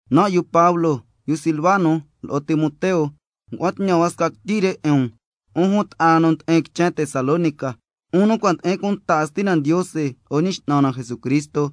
Nan' yu Pablo, yu Silvano lo'o Timoteo, ngua'an tñan hua sca quityi 'in um, 'un jun ta'a na nu ndi'in quichen Tesalónica, 'un nu cua' ndi'in cunta 'in Stina Ndiose lo'o Ñi X'nan na Jesucristo.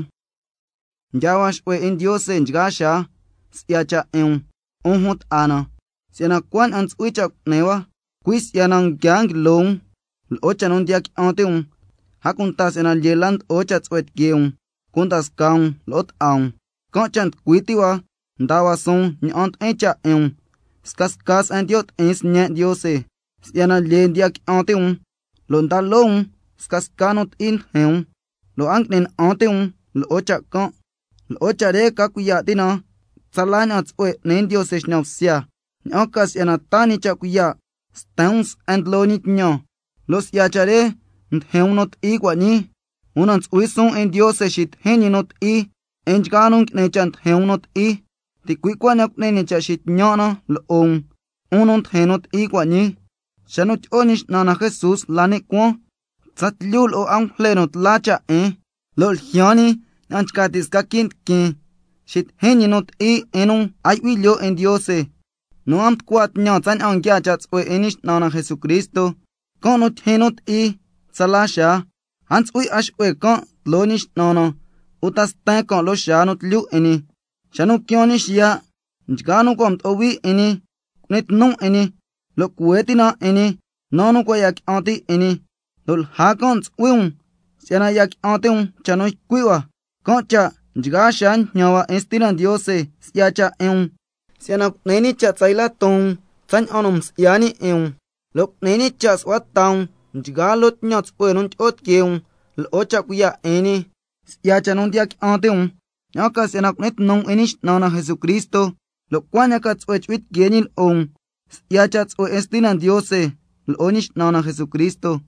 Nga'an cha' tyaa hua xu'hue 'in Ndiose nchgaa xaa si'ya cha' 'in um, 'un jun ta'a na, si'yana cuaña'an ntsu'hui cha' cu'ni hua, una lyee la si'yana nguia nguilo um lo'o cha' nu ndiya qui'an ti' um, a cunta si'yana lyee la ndo'o cha' tsu'hue tiquee um cunda scaa um lo'o ta'a um. Can' cha' nducui ti' hua ndaa hua suun ña'an ndi'in cha' 'in um scasca se'en ndiyo' ti'in sñe' Ndiose, si'yana lyee ndiya qui'an ti' um lo' ndaa loo um scasca nu ti'i ndijin um, lo' a ngui'ni na'an ti' um lo'o cha' can'. Lo'o cha' re ca cuiya' ti' na tsala ña'an tsu'hue n'ni Ndiose xñan bsya, ña'an ca si'yana taa ñi cha' cuiya' sten um se'en ndlo ñi tñan, lo' si'ya cha' re ndijin um nu ti'i cua' ñii, una ntsu'hui suun 'in Ndiose xitijin ñi nu ti'i 'in nchgaa nu ngui'ni cha' ndijin um nu ti'i. Ticui' cuaña'an cu'ni ñi cha' xitñan' na lo'o um, 'un nu ndijin nu ti'i cua' ñii, xa nu tyi'o Ñi X'nan na Jesús la ni' cuaan tsatlyu lo'o angujle nu tla cha' 'in, lo' ljyaan ñi —ña'an nchca ti' sca quii' ndiquin, xitijin ñi nu ti'i 'in nu a yu'hui lyoo 'in Ndiose—, nu a mducua tñan tsaña'an nguiaa cha' tsu'hue 'in Ñi X'nan na Jesucristo, can' nu tyijyin nu ti'i tsala xaa, —a ntsu'hui 'a xu'hue can' tloo Ñi X'nan na uta sten can' loo xaa nu tlyu 'in ñi—, xa nu quiaan ñi xiya', nchgaa nu cua' mdo'o hui 'in ñi cu'ni tnu 'in ñi, lo' cuhue ti' na 'in ñi, naa nu cua' ya qui'an ti' 'in ñi, (lo' lja can' ntsu'hui um si'yana ya qui'an ti' um cha' nu ycui' hua). Can' cha' nchgaa xaa njñan hua 'in Stina Ndiose si'ya cha' 'in um, si'yana cu'ni ñi cha' tsa yla ton um tsaña'an nu msi'ya ñi 'in um, lo' cu'ni ñi cha' su'hua ta um nchgaa loo tñan tsu'hue nu ndyi'o tiquee um lo'o cha' cuiya' 'in ñi, si'ya cha' nu ndiya qui'an ti' um, ña'an ca si'yana cu'ni tnu um 'in Ñi X'nan na Jesucristo, lo' cuaña'an ca tsu'hue chu'hui tiquee ñi lo'o um, si'ya cha' tsu'hue 'in Stina Ndiose lo'o Ñi X'nan na Jesucristo.